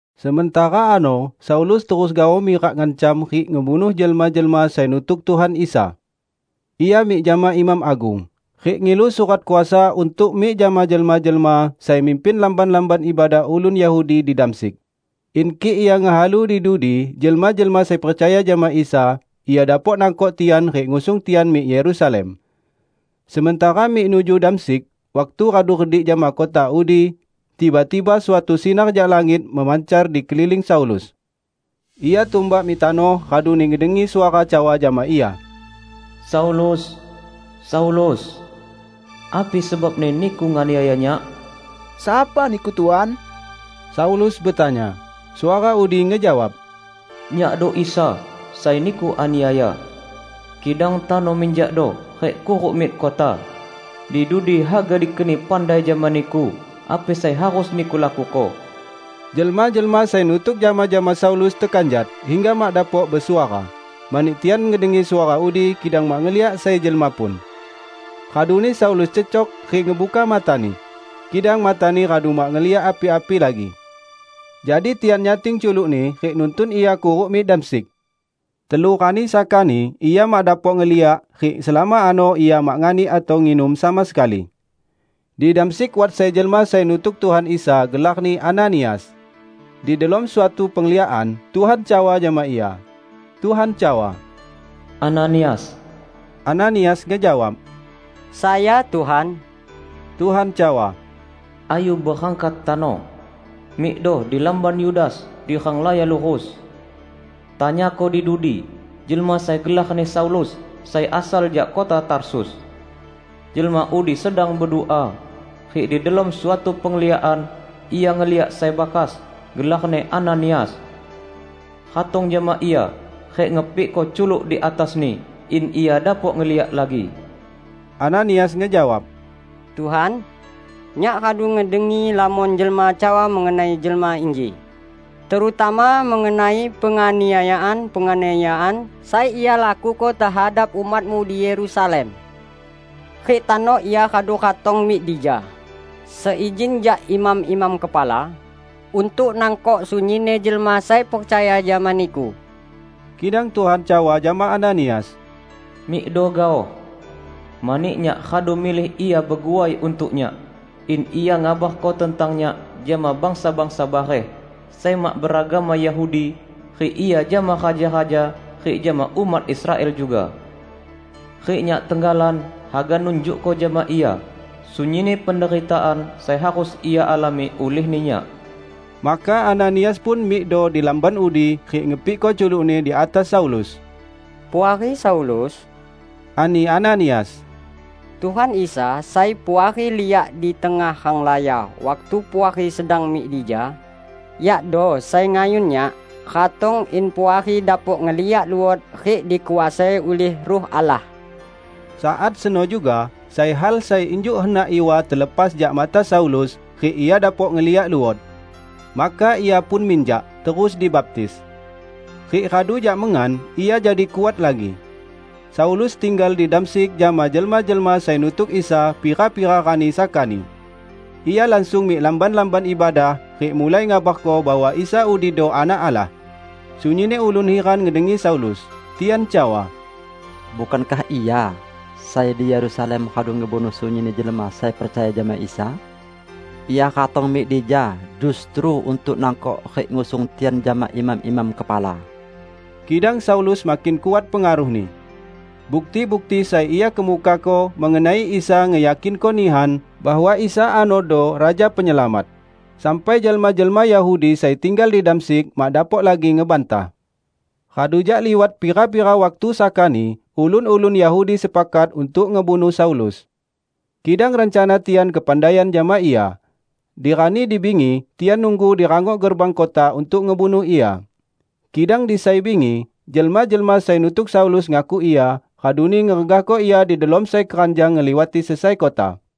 Sementara ano Saulus terus gaoh mirak ngancam rik ngebunuh jelma-jelma sai nutuk Tuhan Isa. Ia mik jama imam agung, rik ngilu surat kuasa untuk mik jama jelma-jelma sai mimpin lamban-lamban ibadah ulun Yahudi di Damsyik, in kik ia ngehalu di dudi jelma-jelma sai percaya jama Isa, ia dapok nangkok tian rik ngusung tian mik Yerusalem. Sementara mik nuju Damsyik, waktu radu redik jama kota udi, tiba-tiba suatu sinar jak langit memancar di keliling Saulus. Ia tumbak mik tanoh raduni ngedengi suara cawa jama ia, "Saulus, Saulus! Api sebabni niku nganiaya Nyak?" "Sapa Niku, Tuan?" Saulus betanya. Suara udi ngejawab, "Nyakdo Isa, sai niku aniaya. Kidang tano minjakdo rik kuruk mik kota. Di dudi haga dikeni pandai jama niku api sai harus niku lakuko." Jelma-jelma sai nutuk jama-jama Saulus tekanjat hingga mak dapok besuara; mani tian ngedengi suara udi kidang mak ngeliak sai jelma pun. Raduni Saulus cecok rik ngebuka matani, kidang matani radu mak ngeliak api-api lagi. Jadi tian nyating culukni rik nuntun ia kuruk mik Damsyik. Telu rani sakani ia mak dapok ngeliak rik selama ano ia mak nganik atau nginum sama sekali. Di Damsyik wat sai jelma sai nutuk Tuhan Isa gelarni Ananias. Di delom suatu pengliakan, Tuhan cawa jama ia. Tuhan cawa, "Ananias!" Ananias ngejawab, "Sayo, Tuhan." Tuhan cawa, "Ayu berangkat tano. Mikdo di lamban Yudas di Renglaya Lurus. Tanyako di dudi jelma sai gelarni Saulus sai asal jak kota Tarsus. Jelma udi sedang bedua, rik di delom suatu pengliakan ia ngeliak sai bakas, gelarni Ananias, ratong jama ia rik ngepikko culuk di atasni in ia dapok ngeliak lagi." Ananias ngejawab, "Tuhan, nyak radu ngedengi lamon jelma cawa mengenai jelma inji, terutama mengenai penganiayaan-penganiayaan sai ia lakuko tehadap umat-Mu di Yerusalem. Rik tano ia radu ratong mik dija seizin jak imam-imam kepala untuk nangkok sunyinni jelma sai percaya jama Niku." Kidang Tuhan cawa jama Ananias, "Mikdo gaoh! Mani Nyak radu milih ia beguai untuk Nyak, in ia ngabarko tentang Nyak jama bangsa-bangsa bareh sai mak beragama Yahudi rik ia jama raja-raja rik jama umat Israel juga. Rik Nyak tenggalan haga nunjukko jama ia sunyinni penderitaan sai harus ia alami ulihni Nyak." Maka Ananias pun mikdo di lamban udi rik ngepikko culukni di atas Saulus. "Puari Saulus," ani Ananias, "Tuhan Isa sai Puari liak di tengah renglaya waktu Puari sedang mik dija, Iado sai ngayun nyak ratong in Puari dapok ngeliak luot rik dikuasai ulih Ruh Allah." Saat seno juga sai hal sai injuk henak iwa telepas jak mata Saulus rik ia dapok ngeliak luot. Maka ia pun minjak, terus dibaptis. Rik radu jak mengan, ia jadi kuat lagi. Saulus tinggal di Damsyik jama jelma-jelma sai nutuk Isa pira-pira rani sakani. Ia langsung mik lamban-lamban ibadah rik mulai ngabarko bahwa Isa udido Anak Allah. Sunyinni ulun hiran ngedengi Saulus. Tian cawa, "Bukankah ia sai di Yerusalem radu ngebunuh sunyinni jelma sai percaya jama Isa? Ia ratong mik dija justru untuk nangkok rik ngusung tian jama imam-imam kepala!" Kidang Saulus makin kuat pengaruhni. Bukti-bukti sai ia kemukako mengenai Isa ngeyakinko nihan bahwa Isa anodo Raja Penyelamat, sampai jelma-jelma Yahudi sai tinggal di Damsyik mak dapok lagi ngebantah. Radu jak liwat pira-pira waktu sakani ulun-ulun Yahudi sepakat untuk ngebunuh Saulus. Kidang rencana tian kepandaian jama ia. Di rani di bingi tian nunggu di rangok gerbang kota untuk ngebunuh ia. Kidang di sai bingi, jelma-jelma sai nutuk Saulus ngakuk ia, raduni ngeregahko ia di delom sai keranjang ngeliwati sesai kota.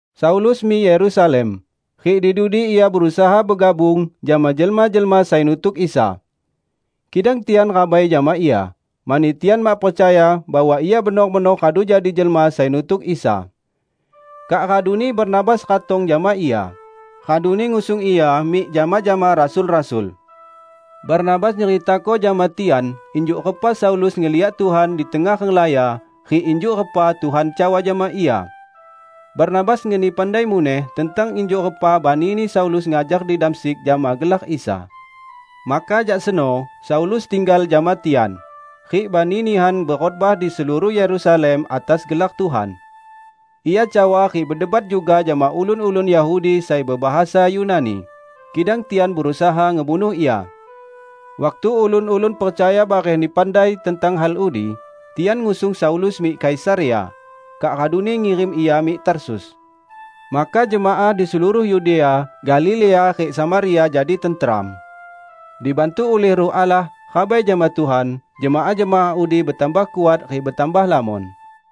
Saulus mik Yerusalem, rik di dudi ia berusaha begabung jama jelma-jelma sai nutuk Isa. Kidang tian rabai jama ia, mani tian mak percaya bahwa ia benor-benor radu jadi jelma sai nutuk Isa. Kak raduni Barnabas ratong jama ia, raduni ngusung ia mik jama-jama rasul-rasul. Barnabas nyeritako jama tian injuk repa Saulus ngeliak Tuhan di tengah renglaya rik injuk repa Tuhan cawa jama ia. Barnabas ngeni pandai muneh tentang injuk repa banini Saulus ngajar di Damsyik jama gelar Isa. Maka jak seno Saulus tinggal jama tian, rik bani nihan bekhotbah di seluruh Yerusalem atas gelar Tuhan. Ia cawa rik bedebat juga jama ulun-ulun Yahudi sai bebahasa Yunani, kidang tian berusaha ngebunuh ia. Waktu ulun-ulun percaya barehni pandai tentang hal udi, tian ngusung Saulus mik Kaisarea, kak raduni ngirim ia mik Tarsus. Maka jemaah di seluruh Yudea, Galilea rik Samaria jadi tenteram. Dibantu ulih Ruh Allah, rabai jama Tuhan, jemaah-jemaah udi betambah kuat rik betambah lamon.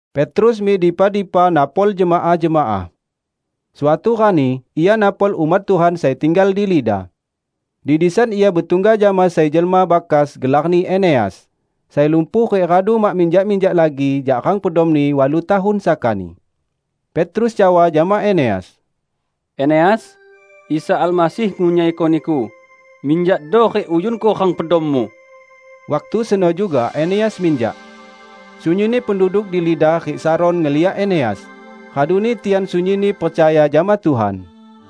Petrus mik dipa-dipa napol jemaah-jemaah. Suatu rani ia napol umat Tuhan sai tinggal di Lida. Di disan ia betungga jama sai jelma bakas gelarni Eneas, sai lumpuh rik radu mak minjak-minjak lagi jak rang pedomni walu tahun sakani. Petrus cawa jama Eneas, "Eneas, Isa Almasih ngunyaiko niku. Minjakdo rik uyunko rang pedommu." Waktu seno juga Eneas minjak. Sunyinni penduduk di Lida rik Saron ngeliak Eneas, raduni tian sunyinni percaya jama Tuhan.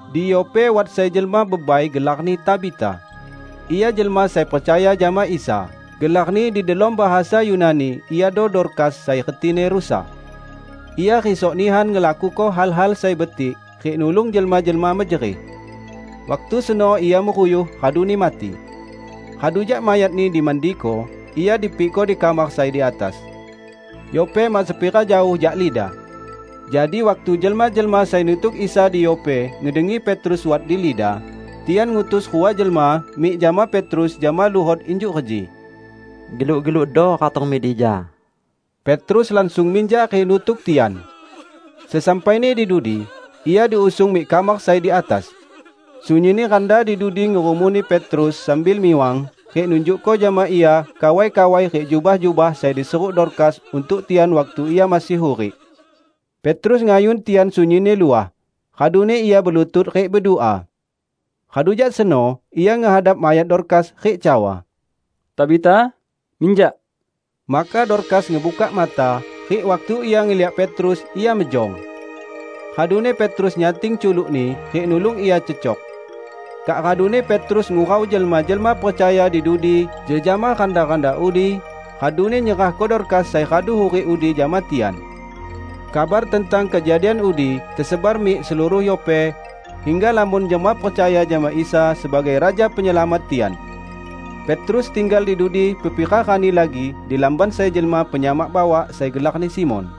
Di Yope wat sai jelma bebai gelarni Tabita. Ia jelma sai percaya jama Isa. (Gelarni di delom bahasa Yunani iado Dorkas sai retini rusa.) Ia risok nihan ngelakuko hal-hal sai betik rik nulung jelma-jelma mejerih. Waktu seno ia meruyuh raduni mati. Radu jak mayatni dimandiko, ia dipikko di kamar sai di atas. Yope mak sepira jaoh jak Lida. Jadi waktu jelma-jelma sai nutuk Isa di Yope ngedengi Petrus wat di Lida, tian ngutus rua jelma mik jama Petrus jama luhot injuk reji, "Geluk-gelukdo ratong mik dija." Petrus langsung minjak rik nutuk tian. Sesampaini di dudi, ia diusung mik kamar sai di atas. Sunyinni randa di dudi ngerumuni Petrus sambil miwang rik nunjukko jama ia kawai-kawai rik jubah-jubah sai diseruk Dorkas untuk tian waktu ia masih hurik. Petrus ngayun tian sunyinni luah, raduni ia belutut rik bedua. Radu jak seno ia ngehadap mayat Dorkas rik cawa, "Tabita, minjak!" Maka Dorkas ngebukak mata, rik waktu ia ngeliak Petrus, ia mejong. Raduni Petrus nyating culukni rik nulung ia cecok. Kak raduni Petrus ngurau jelma-jelma percaya di dudi jejama randa-randa udi, raduni nyerahko Dorkas sai radu hurik udi jama tian. Kabar tentang kejadian udi tesebar mik seluruh Yope, hingga lamon jelma percaya jama Isa sebagai Raja Penyelamat tian. Petrus tinggal di dudi pepira rani lagi di lamban sai jelma penyamak bawak sai gelarni Simon.